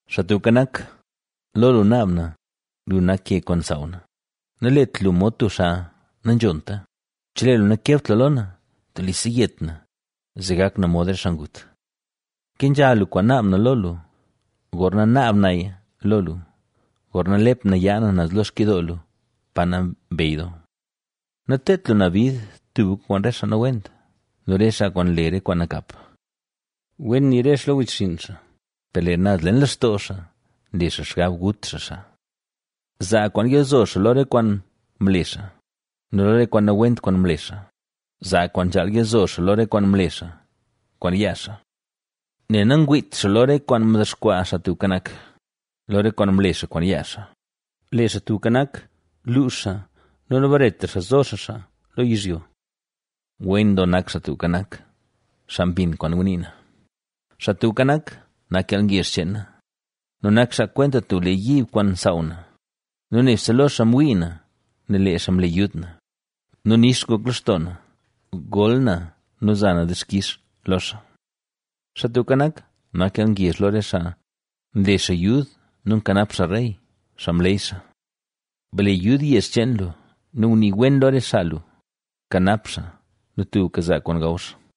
Xaa Tubka Nak, lo lu naab na, lu nak ke kwaan nsaaw na. Nalet lu mod tub xaa nanzhonta, chelee lu nakebt lu lo na, telise yet na, zee gak na mod re xaa ngut. Kenzha lu kwaan naab na lo lu, gorna naab naya lo lu, gorna lep na yaa na naz lo xkidoo lu, pa Nambey Doo. Nateedt lu na bid tubka kwaan re xaa nawent nu re xaa kwaan nle re kwaan nakap. Wen nii re xaa lo re wechxinn, per lee naz leen lextoo xaa nle xaa xgab gut xaa xaa. Zaa kwaan yalzo xaa lo re kwaan mle xaa nu lo re kwaan nawent kwaan mle xaa; zaa kwaan nzhaal yalzo xaa lo re kwaan mle xaa kwaan yaa xaa. Nel nangwiit xaa lo re kwaan mdexkwaa Xaa Tubka Nak, lo re kwaan mle xaa kwaan yaa xaa, lee Xaa Tubka Nak, luux xaa nu nabaretra xaa zo xaa xaa lo yizhyo. ¡Wen doo nak Xaa Tubka Nak, xaa mbin kwaan ngunii na! Xaa Tubka Nak, nak yalngezh cheen na nu nak xaa kwenta tub lee yiib kwaan nsaaw na nu nebse lo xaa mwii na nel lee xaa mle yud na nu nix ngok lextoo na. Gol na nu za na dixkix lo xaa. Xaa Tubka Nak, nak yalngezh lo re xaa, nle xaa yud nu nkanap xaa rey, xaa mleey xaa. Ble yud yezh cheen lu nu gunii wen lo re xaa lu, bkanap xaa nu tubka zaa kwaan gaw xaa.